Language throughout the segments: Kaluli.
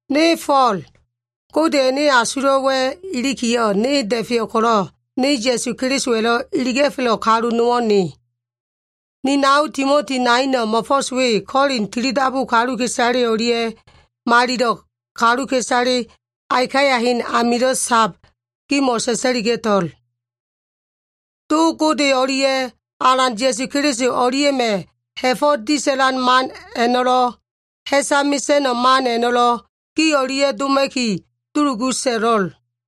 Ne Fo꞉l, Godeya꞉ ene asulo꞉wa꞉ ilikiyo꞉, ne da꞉feyo꞉ ko꞉lo꞉, ne Ya꞉su Kelisowa꞉lo꞉ iliga꞉felo꞉ kalu nowo꞉ ne. Ni nao Timoti naino꞉ mo꞉fo꞉s we Kolin tilidabu kaluka꞉isale o꞉lia꞉, malilo꞉ kaluka꞉isale Akaya hen amilo꞉ sab gimo꞉ sa꞉sa꞉liga꞉to꞉l. Do Gode o꞉lia꞉ Alan Ya꞉su Keliso o꞉lia꞉ma꞉ ha꞉fo꞉ disa꞉lan man a꞉no꞉lo꞉, ha꞉sa mesa꞉no꞉ man a꞉no꞉lo꞉ gi o꞉lia꞉ doma꞉ki dulugu so꞉lo꞉l.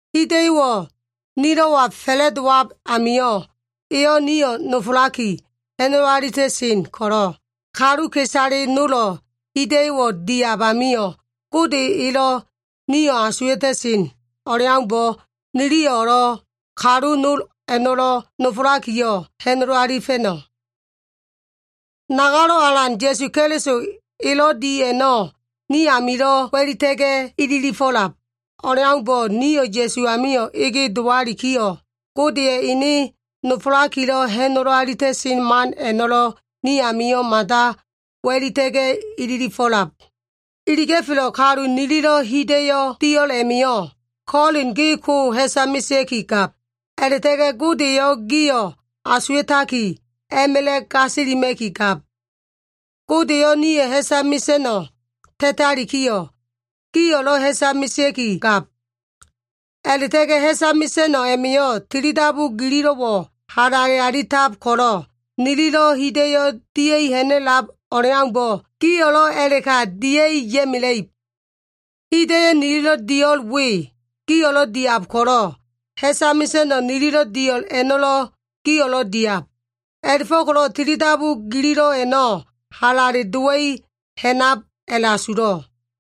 Hida꞉yo꞉wo꞉ nilo꞉wa fa꞉la꞉dowab amio꞉, eyo꞉ nio꞉ nofolaki, ha꞉nolo alita꞉sen ko꞉lo꞉, kaluka꞉isale nolo꞉ hida꞉yo꞉wo꞉ diab amio꞉, Gode elo꞉ nio꞉ asuwa꞉ta꞉sen o꞉leaumbo꞉, niliyo꞉lo꞉ kalu nol a꞉no꞉lo꞉ nofolakiyo꞉, ha꞉nolo alifa꞉no꞉. Nagalo꞉ Alan Ya꞉su Keliso elo꞉ di a꞉no꞉ ni amilo꞉ wa꞉lita꞉ga꞉ ililifo꞉lab o꞉leaumbo꞉, nio꞉ Ya꞉su amio꞉ ege dowalikiyo꞉, Godeya꞉ ene nofolakilo꞉ ha꞉nolo alita꞉sen man a꞉no꞉lo꞉ ni amio꞉ mada wa꞉lita꞉ga꞉ ililifo꞉lab. Iliga꞉felo꞉ kalu nililo꞉ hida꞉yo꞉ dio꞉l a꞉ma꞉yo꞉, Kolin gi ko ha꞉sa mesea꞉ki gab, a꞉la꞉ta꞉ga꞉ Gode eyo꞉ gio꞉ asuwa꞉taki a꞉ma꞉la꞉ gasilima꞉ki gab. Gode eyo꞉ nio꞉ ha꞉sa mesa꞉no꞉ ta꞉talikiyo꞉, gio꞉lo꞉ ha꞉sa mesea꞉ki gab. A꞉la꞉ta꞉ga꞉ ha꞉sa mesa꞉no꞉ a꞉ma꞉yo꞉ tilidabu gililo꞉wo꞉ halale alita꞉lab ko꞉lo꞉, nililo꞉ hida꞉yo꞉ dia꞉i ha꞉na꞉lab o꞉leaumbo꞉, gio꞉lo꞉ a꞉la꞉ka dia꞉ ya꞉mela꞉ib. Hida꞉yo꞉ nililo꞉ dio꞉l we, gio꞉lo꞉ diab ko꞉lo꞉, ha꞉sa mesa꞉no꞉ nililo꞉ dio꞉l a꞉no꞉lo꞉ gio꞉lo꞉ diab. A꞉la꞉fo꞉ko꞉lo꞉ tilidabu gililo꞉ a꞉no꞉ halale dowa꞉i ha꞉nab a꞉la꞉asulo꞉.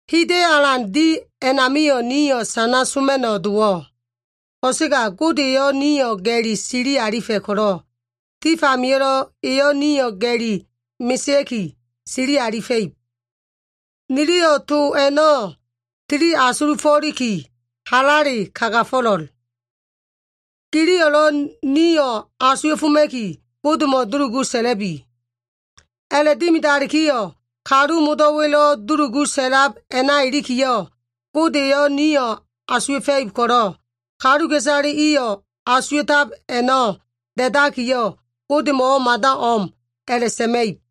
Hida꞉yo꞉ alan di a꞉namio꞉ nio꞉ sana soma꞉no꞉ dowo꞉. Ko꞉sega Gode eyo꞉ nio꞉ ga꞉li sili alifa꞉ ko꞉lo꞉, tif amio꞉lo꞉ eyo꞉ nio꞉ ga꞉li mesea꞉ki, sili alifa꞉ib. Niliyo꞉ to a꞉no꞉ tili asulufo꞉liki halale kagafo꞉lo꞉l. Giliyo꞉lo꞉ nio꞉ asuwa꞉foma꞉ki, Godemo꞉ dulugu sa꞉la꞉bi. A꞉la꞉dimidalikiyo꞉, kalu modo꞉wa꞉lo꞉ dulugu sa꞉lab a꞉na ilikiyo꞉, Gode eyo꞉ nio꞉ asuwa꞉fa꞉ib ko꞉lo꞉, kaluka꞉isale iyo꞉ asuwa꞉tab a꞉no꞉ da꞉dakiyo꞉ Godemo꞉wo꞉ mada o꞉m a꞉la꞉sa꞉ma꞉ib.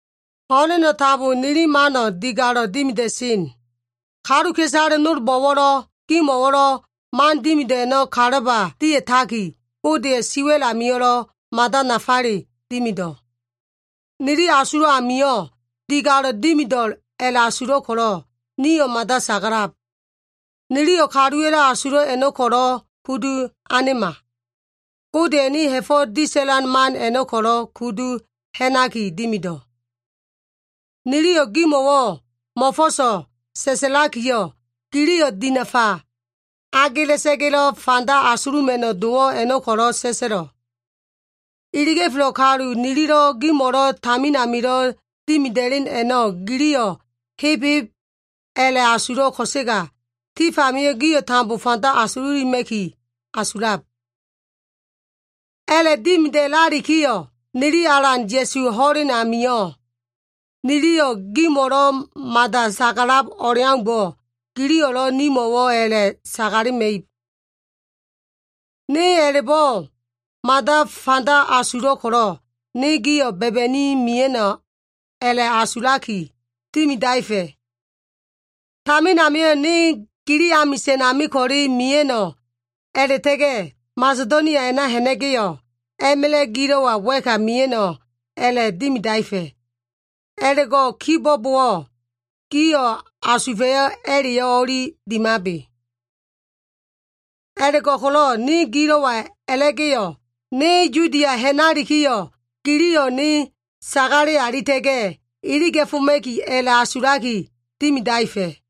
Ho꞉leno꞉ tambo nili mano꞉ digalo꞉ dimida꞉sen. Kaluka꞉isale nolbo꞉wo꞉lo꞉, gimo꞉wo꞉lo꞉ man dimido꞉ a꞉no꞉ kalaba dia꞉taki, Godeya꞉ siwa꞉l amio꞉lo꞉ mada nafale dimido꞉. Nili asulo꞉ amio꞉ digalo꞉ dimido꞉l a꞉la꞉asulo꞉ ko꞉lo꞉, nio꞉ mada sagalab. Niliyo꞉ kaluwa꞉lo꞉ asulo꞉ a꞉no꞉ ko꞉lo꞉ kudu anema. Godeya꞉ ene ha꞉fo꞉ disa꞉lan man a꞉no꞉ ko꞉lo꞉ kudu ha꞉naki dimido꞉. Niliyo꞉ gimo꞉wo꞉ mo꞉fo꞉so꞉ sa꞉sa꞉lakiyo꞉, giliyo꞉ dinafa agela꞉sa꞉ga꞉lo꞉ fanda asuluma꞉no꞉ dowo꞉ a꞉no꞉ ko꞉lo꞉ sa꞉sa꞉lo꞉. Iliga꞉felo꞉ kalu nililo꞉ gimo꞉lo꞉ tamin amilo꞉ dimida꞉len a꞉no꞉ giliyo꞉ heb heb a꞉la꞉asulo꞉ ko꞉sega, tif amio꞉ gio꞉ tambo fanda asululima꞉ki asulab. A꞉la꞉dimida꞉lalikiyo꞉, nili Alan Ya꞉suwa꞉ ho꞉len a꞉namio꞉, niliyo꞉ gimo꞉lo꞉ mada sagalab o꞉leaumbo꞉, giliyo꞉lo꞉ nimo꞉wo꞉ a꞉la꞉ sagalema꞉ib. Ne a꞉la꞉bo꞉ mada fanda asulo꞉ ko꞉lo꞉, ne gio꞉ ba꞉ba꞉ni mia꞉no꞉ a꞉la꞉asulaki dimidaefa꞉. Tamin amio꞉ ne gili amisa꞉n ami ko꞉le mia꞉no꞉, a꞉la꞉ta꞉ga꞉ Masedonia a꞉na ha꞉na꞉ga꞉yo꞉, a꞉ma꞉la꞉ gilo꞉wa wa꞉ka mia꞉no꞉ a꞉la꞉ dimidaefa꞉. A꞉la꞉go꞉ kibo꞉bowo꞉, gio꞉ asufa꞉yo꞉ a꞉la꞉yo꞉ o꞉li dimabe. A꞉la꞉go꞉ko꞉lo꞉ ne gilo꞉wa a꞉la꞉ga꞉yo꞉, ne Yudia ha꞉nalikiyo꞉, giliyo꞉ ne sagale alita꞉ga꞉ iliga꞉foma꞉ki a꞉la꞉asulaki dimidaefa꞉.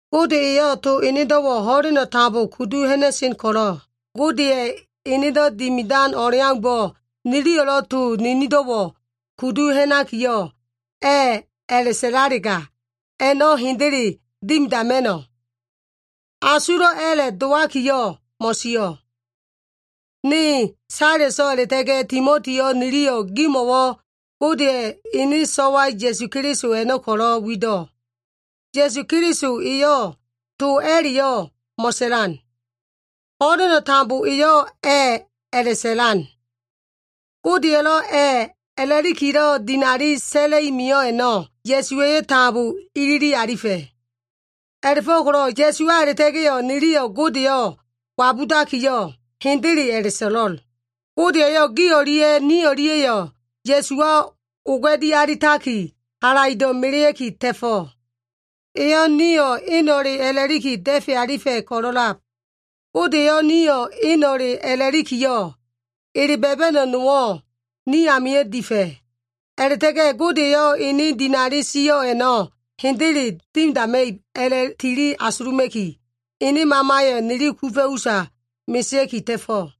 Gode eyo꞉ to enedo꞉wo꞉ ho꞉leno꞉ tambo kudu ha꞉na꞉sen ko꞉lo꞉, Godeya꞉ enedo꞉ dimidan o꞉leaumbo꞉, niliyo꞉lo꞉ to ninindo꞉wo꞉ kudu ha꞉nakiyo꞉, “A꞉” a꞉la꞉sa꞉lalega, a꞉no꞉ hendele dimidama꞉no꞉. Asulo꞉ a꞉la꞉ dowakiyo꞉, mo꞉sio꞉. Ne, Saleso꞉, a꞉la꞉ta꞉ga꞉ Timotiyo꞉ niliyo꞉ gimo꞉wo꞉ Godeya꞉ ene so꞉wa Ya꞉su Keliso a꞉no꞉ ko꞉lo꞉ wido꞉. Ya꞉su Keliso eyo꞉ to a꞉la꞉yo꞉ mo꞉sa꞉lan. Ho꞉leno꞉ tambo eyo꞉ “A꞉” a꞉la꞉sa꞉lan. Godeya꞉lo꞉ “A꞉” a꞉la꞉likilo꞉ dinali sa꞉la꞉i mio꞉ a꞉no꞉, Ya꞉suwa꞉yo꞉ tambo ilili alifa꞉. A꞉la꞉fo꞉ko꞉lo꞉ Ya꞉suwa a꞉la꞉ta꞉ga꞉yo꞉, niliyo꞉ Godeyo꞉ wabudakiyo꞉, “Hendele” a꞉la꞉so꞉lo꞉l. Gode eyo꞉ gi o꞉lia꞉ ni o꞉lia꞉yo꞉ Ya꞉suwa oga꞉di alitaki, halaido꞉ melea꞉ki ta꞉fo꞉. Eyo꞉ nio꞉ eno꞉le a꞉la꞉liki da꞉fe alifa꞉ ko꞉lo꞉lab. Gode eyo꞉ nio꞉ eno꞉le a꞉la꞉likiyo꞉, ele ba꞉ba꞉no꞉ nowo꞉ ni amio꞉ difa꞉. A꞉la꞉ta꞉ga꞉ Gode eyo꞉ ene dinali sio꞉ a꞉no꞉ hendele dimidama꞉ib a꞉la꞉tili asuluma꞉ki, ene Mamayo꞉ nili kufa꞉ usa mesea꞉ki ta꞉fo꞉.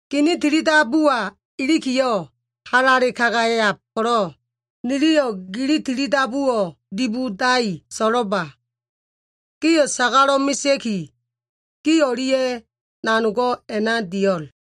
Gini tilidabuwa ilikiyo꞉, halale kagayab ko꞉lo꞉, niliyo꞉ gili tilidabuwo꞉ dibodai so꞉lo꞉lba. Gio꞉ sagalo꞉ mesea꞉ki, gi o꞉lia꞉ nanogo꞉ a꞉na dio꞉l.